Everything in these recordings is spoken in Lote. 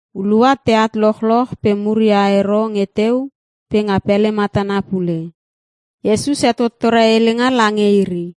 Hulua teat lochloch pe muria ero nge teu pe nga pele matana pule. Iesus hetottore helenga lange iri,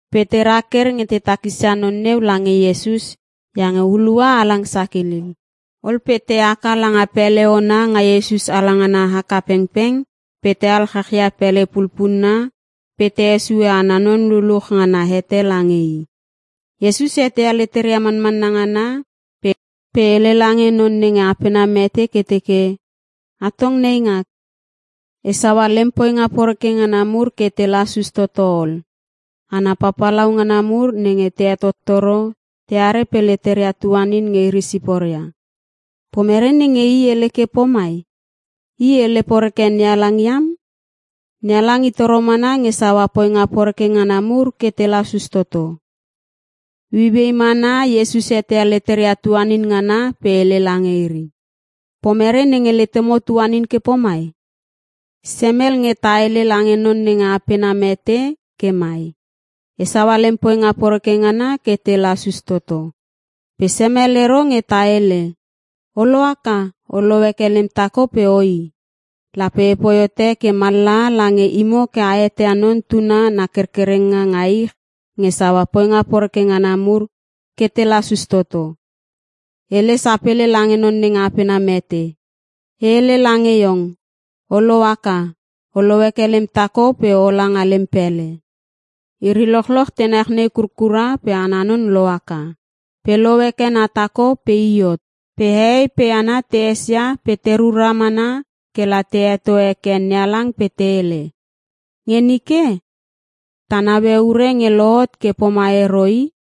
Pe te raker nge te takisia non neu lange Iesus iange hulua halang sakilil. Ol pe te haka langa pele ona nga Iesus alangana haka pengpeng pe te alchachia pele pulpunna pe te hesue ana non luluch nga na hete lange i. Iesus eteia leteria manmanna ngana pe hele lange non nenge apena mete ke teke, “Atong neingak, e saua lem poinga poreke ngana mur ke te lasus toto ol.” Hana papalau ngana mur nenge te hetottoro, teare pe leteria tuanin nge iri siporia. “Pomere nenge i hele ke pomai? I hele poreke NeHalang iam. NeHalang i toro mana nge saua poinga poreke ngana mur ke te lasus toto.” Ueiuei mana Iesus eteia leteria tuanin ngana pe hele lange iri, “Pomere nenge letemo tuanin ke pomai? Semel nge ta hele lange non nenge apena mete ke mai, ‘E saua lem poinga poreke ngana ke te lasus toto.’ Pe semel ero nge ta hele, ‘O lohaka, olou heke lem tako pe oi.’ Lape epoi hote ke mallaha lange imo ke a eteia Non Tuna na kerkerenga nga ich nge saua poinga poreke ngana mur ke te lasus toto.” Hele sapele lange non nenge apena mete, “E hele lange iong, o lohaka, olou heke lem tako pe ola nga lem pele.” Iri lochloch te nechnei kurkura pe ana non lohaka, pe lou heke na tako pe i hot. Pe hehei pe hana te esia pe te rura mana kela te heto heke NeHalang pe te hele, “Nge nike ta neue ure nge lohot ke pomai ero i!”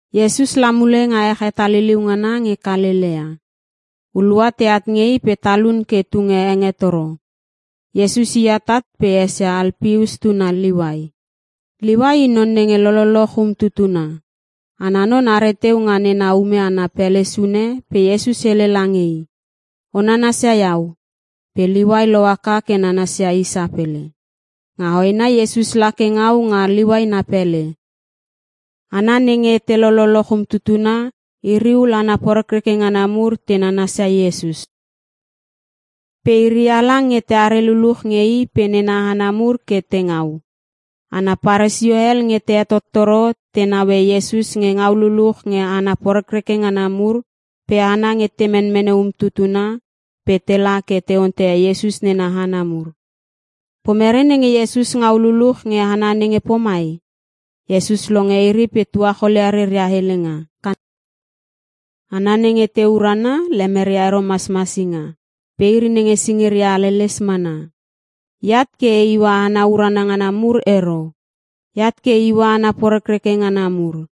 Iesus la mule nga ech hetaliliu ngana nge Kalelea. Hulua teat nge i pe talun ke tunge hengetoro. Iesus i atat pe esia Alpeus tuna Liuai. Liuai i non nenge lololoch umtutuna. Ana non are teu nga nena ume ana pele sune pe Iesus hele lange i, “O nanasia iau.” pe Liuai lohaka ke nanasia i sapele. Nga hoena Iesus la ke ngau nga Liuai na pele. Hana nenge te lololoch umtutuna iri ul hana porekreke ngana mur te nanasia Iesus. Pe iri halang nge teare luluch nge i pe nena hana mur ke te ngau. Hana Paresio hel nge te hetottoro tenaue Iesus nge ngau luluch nge hana porekreke ngana mur, pe hana nge te menmene umtutuna pe tela ke te onteia Iesus nena hana mur, “Pomere nenge Iesus ngau luluch nge hana nenge pomai?” Iesus longe iri pe tuacholia reria helenga, “Hana nenge te urana lemeria ero masmasinga pe iri nenge singiria haleles mana. Eat ke e iua hana urana ngana mur ero. Eat ke e iua hana porekreke ngana mur.”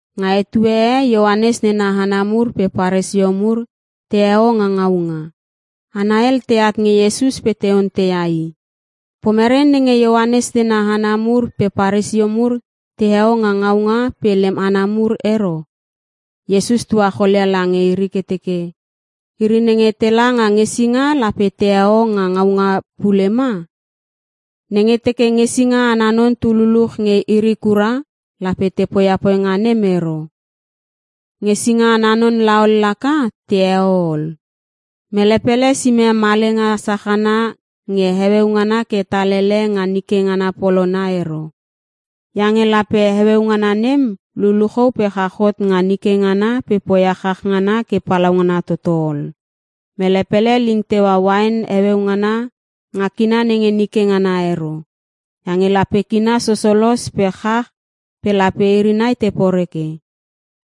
Nga etue e Ioanes nena hana mur pe Paresio mur teheo nga ngaunga. Hana hel teat nge Iesus pe te onteia i, “Pomere nenge Ioanes nena hana mur pe Paresio mur teheo nga ngaunga pe lem hana mur ero?” Iesus tuacholia lange iri ke teke, “Iri nenge tela nga ngesinga lape teheo nga ngaunga pule ma? Nenge teke ngesinga ana non tu luluch nge iri kura lape te poia poinga nem ero. Ngesinga ana non la ol, laka teheo ol. “Mele pele sime malenga sachana nge heueu ngana ke tal ele nga nike ngana polona ero. Iange lape heueu ngana nem luluchou pe chach hot nga nike ngana pe poia chach ngana ke palaungana toto ol. Mele pele ling teua uain heueu ngana nga kina nenge nike ngana ero. Iange lape kina sosolos pe chach pe lape iri nai te poreke.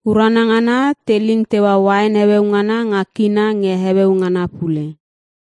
Urana ngana te ling teua uain heueu ngana nga kina nge heueu ngana pule.”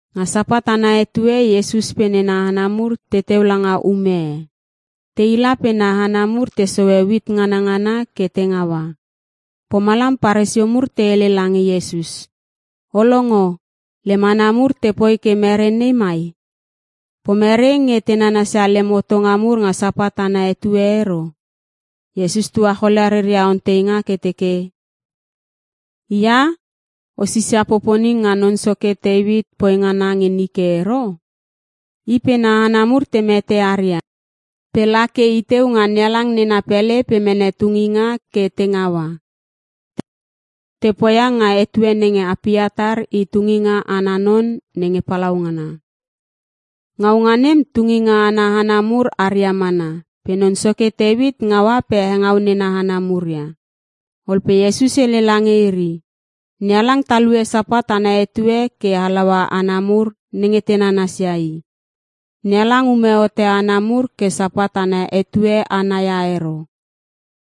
Nga Sapat ana etue Iesus pe nena hana mur teteu langa ume e. Tei la pe na hana mur te sohe uit nganangana ke te ngaua. Pomalam Paresio mur te hele lange Iesus, “O longo, lem hana mur tepoi ke mere nei mai? Pomere nge te nanasia lemem hotonga mur nga Sapat ana etue ero?” Iesus tuacholia reria onteinga ke teke, “Ia!? O sisia poponing nga non soke Teuit poi ngana nge nike ero? I pe na hana mur te mete aria pe la ke i teu nga NeHalang nena pele pe mene tunginga ke te ngaua. Te poia nga etue nenge Apiatar i tunginga ana non nenge palaungana. Ngaunga nem tunginga ana hana mur aria mana pe non soke Teuit ngaua pe hengau nena hana mur ia.” Ol pe Iesus hele lange iri, “NeHalang talue Sapat ana etue ke halaua hana mur nenge te nanasia i. NeHalang ume hote hana mur ke Sapat ana etue ana ia ero.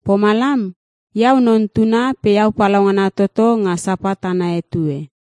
Pomalam, Iau Non Tuna pe iau palaungana toto nga Sapat ana etue.”